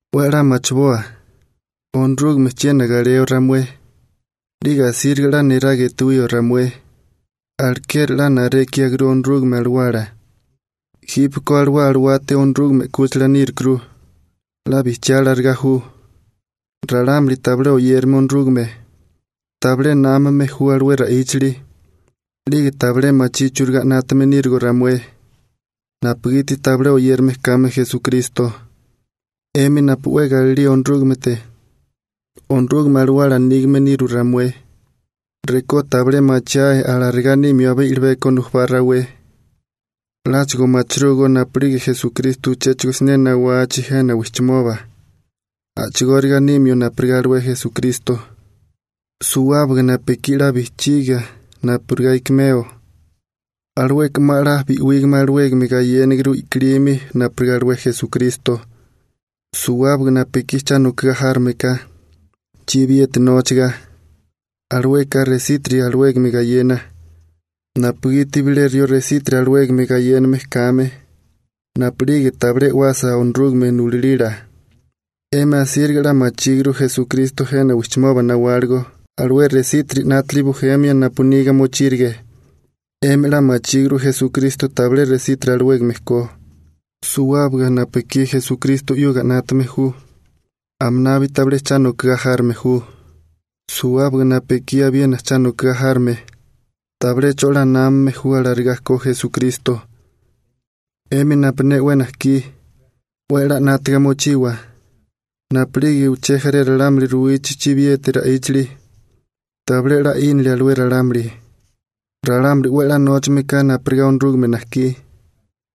'We 'la machiboa, Onorúgame chiena galeo ramué, 'lige asíriga 'la niraga etuwío ramué. Alekeri 'la narékiaguru Onorúgame Alawala, jípeko alué alawate Onorúgame 'kúchila nírukuru, 'la bijchiá alarigá ju. Ralámuli tabilé oyérame Onorúgame, tabilé námame ju alué ra'íchali, 'lige tabilé machí churigá 'nátame nírigo ramué, napugiti tabilé oyérame kame Esukristo. 'Emi napu 'we galilía Onorúgamete, Onorúgame Alawala nígame nirú ramué. Rekó tabilé machiae alarigá nímio abé i'libeko nujubá rawé, 'láchigo machirúgó napu'lige Esukristo uchéchigo siné nawachi jena wijchimoba a'chigóriga nimio napurigá alué Esukristo. Suwábaga napu ekí 'la bijchiga napurigá ikimeo, alueka 'ma 'la bi'wígame alawégame gayéniguru i'kilimi napurigá alué Esukristo. Suwábaga napu ekí cha nokagá járome ka, chibiyeti nóchaga, alueka resítiri alawégame gayena, napugiti bilé rió resítiri alawégame gayéname kame napu'lige tabilé e'wasa Onorúgame nulalila. 'Emi asíriga 'la machíguru Esukristo jena wijchimoba nawáligo alué resítiri 'nátili bujemia napu niga mochírige. 'Emi 'la machíguru Esukristo tabilé resítiri alawégame ko. Suwábaga napu ekí Esukristo 'yuga 'nátame ju aminabi tabilé cha nokagá járome ju. Suwábaga napu ekí abiena cha nokagá járome tabilé 'cho 'la námame ju alarigá ko Esukristo. 'Emi napu ne 'we najkí, 'we 'la 'nátaga mochiwa napu'lige uché jaré ralámuli ruwichi chibiyeti ra'íchili. Tabilé 'la 'ínili alué ralámuli. Ralámuli 'we 'la nóchame ka napurigá Onorúgame najkí,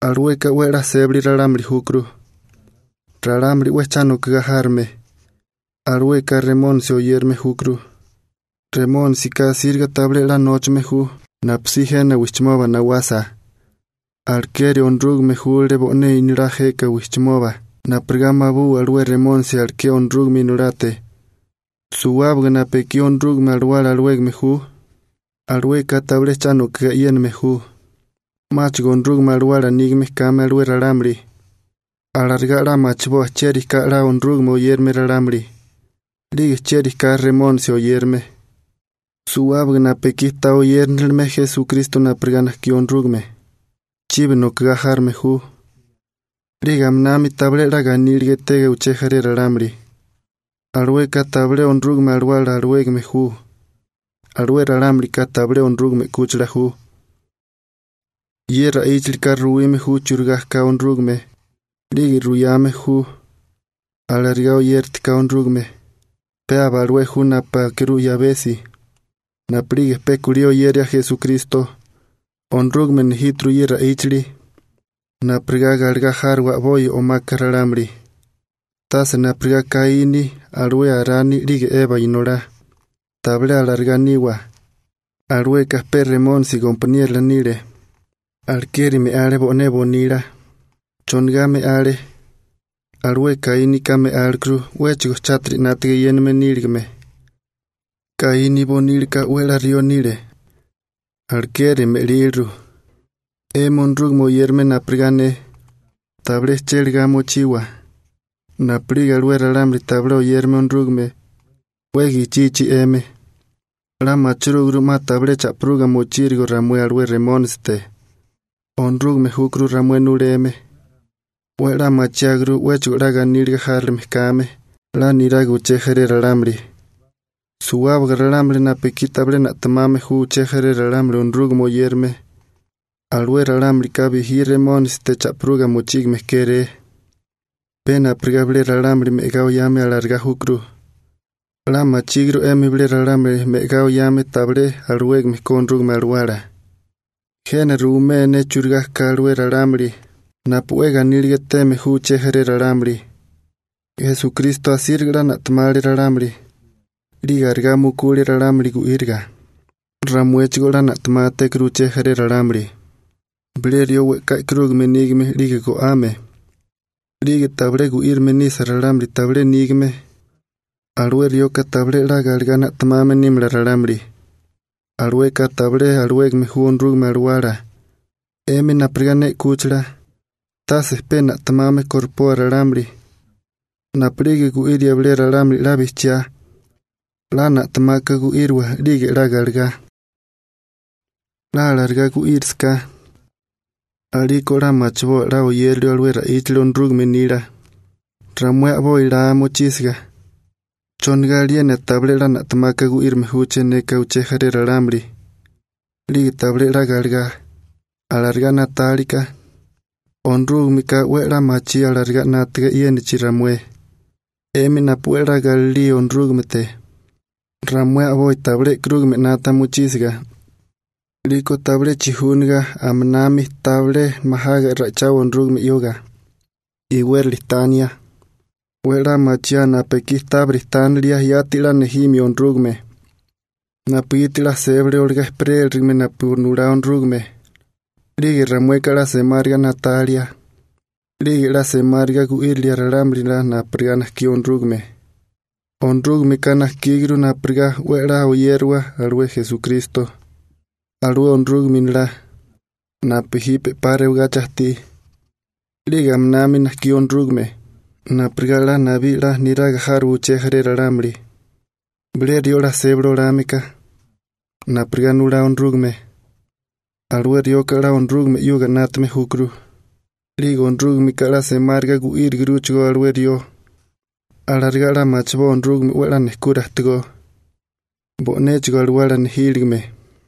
alueka 'we 'la sébali ralámuli júkuru. Ralámuli 'we cha nokagá járome, alueka Remónisi oyérame júkuru. Remónisika asíriga tabilé 'la nóchame ju napusí jena wijchimoba nawasa. Alekeri Onorúgame júlale bo'né Inolá jeka wijchimoba napurigá mabuwa alué Remónisi aleké Onorúgame Inolate. Suwábaga napu ekí Onorúgame Alawala alawégame ju, alueka tabilé cha nokigá e'yéname ju, 'máchigo Onorúgame Alawala nígame kame alué ralámuli. Alarigá 'la machiboa chieri ka 'la Onorúgame oyérame ralámuli, 'lige chieri ka Remónisi oyérame. Suwábaga napu ekí ta oyérinilime Esukristo napurigá najkí Onorúgame, chibi nokigá járome ju, 'lige aminami tabilé 'la ganíliga etega uché jaré ralámuli, alueka tabilé Onorúgame Alawala alawégame ju. Alué ralámulika tabilé Onorúgame 'kúchila ju. Ye ra'íchalika ruyame ju churigá ka Onorúgame, 'lige ruyame ju alarigá oyératika Onorúgame, pe aba alué ju napu akirú 'yabesi napu'lige pe kulí oyeria Esukristo. Onorúgame nejíturu ye ra'íchali napurigá galegá járowa a'bopi o'maka ralámuli. Tase napurigá Kaíni, alué Arani 'lige Eba inolá, tabilé alarigá niwa, alueka pe Remónisi gompaniérola nile, alekeri me'ale bo'né bonila. ¿Chonigá me'ale? Alué Kaínika me'álekuru 'wéchigo chátiri 'nátaga eyéname níligame. Kaíni bonílaka 'we 'la rió nile, alekeri me'líliru. 'Emi Onorúgame oyérame napurigá ne, tabilé chélagá mochiwa napu'lige alué ralámuli tabilé oyérame Onorúgame 'we gichichi 'emi. 'La machirúguru 'ma tabilé cha'piruga mochírigo ramué alué Remónisite. Onorúgame júkuru ramué nuleme. 'We 'la machiáguru 'wéchigo 'la ganíliga járilime kame 'la niraga uché jaré ralámuli. Suwábaga ralámuli napu ekí tabilé na'temame ju uché jaré ralámuli Onorúgame oyérame alué ralámulika bijí Remónisite cha'piruga mochígame kéré, pe napurigá bilé ralámuli me'agá oyame alarigá júkuru. 'La machíguru 'emi bilé ralámuli me'agá oyame tabilé alawégame ko Onorúgame Alawala. Jena ruwimé ne churigá ka alué ralámuli napu 'we ganíliga eteme ju uché jaré ralámuli: Esukristo asíriga 'la na'temale ralámuli, 'lige arigá mukule ralámuli gu'íriga. Ramuéchigoó'la na'temátékuru uché jaré ralámuli. Bilé rió we'ká e'karúgame nígame 'lige go'ame, 'lige tabilé gu'írame nisa ralámuli tabilé nígame, alué rioka tabilé 'la galegá na'temame nímala ralámuli. Alueka tabilé alawégame ju Onorúgame Alawala. 'Emi napurigá ne 'kúchila, tase pe na'temame koripoa ralámuli. Napu'lige gu'iria bilé ralámuli 'la bijchiá 'la na'temaka gu'íriwa 'lige 'la galegá. 'La alarigá gu'írisiká a'liko 'la machiboa 'la oyérilio alué ra'íchali Onorúgame nila. Ramué a'boi laa mochísiga: «¿Chonigá aliena tabilé 'la na'temaka gu'írame júché neka uché jaré ralámuli 'lige tabilé 'la galegá?» Alarigá na'tálika, Onorúgameka 'we 'la machí alarigá 'nátaga e'yénachi ramué. 'Emi napu 'we 'la galilía Onorúgamete, ramué a'boi tabilé e'karúgame 'nata mochísiga 'liko tabilé chijúniga aminami tabilé majaga ra'ichawa Onorúgame 'yuga, iwérali tania. 'We 'la machiaa napu ekí tábiri tánilia yati 'la nejimio Onorúgame, napugiti 'la sébali olagá ejperélirigime napu nulá Onorúgame, 'lige ramueka 'la semáriga na'talia, 'lige 'la semáriga gu'írilia ralámuli 'la napurigá najkí Onorúgame. Onorúgameka najkíguru napurigá 'we 'la oyériwa alué Esukristo, alué Onorúgame Inolá napu jipe 'pa rewagachi ajtí. 'Lige aminami najkí Onorúgame napurigá 'la nabí 'la niraga járowa uché jaré ralámuli. Bilé rió 'la sébali olame ka napurigá nulá Onorúgame, alué rioka 'la Onorúgame 'yuga 'nátame júkuru, 'lige Onorúgameka 'la semáriga gu'íriguruchigó alué rió. Alarigá 'la machiboa Onorúgame 'we 'la nejkura ajtigó, bo'néchigo alawala nejíligime.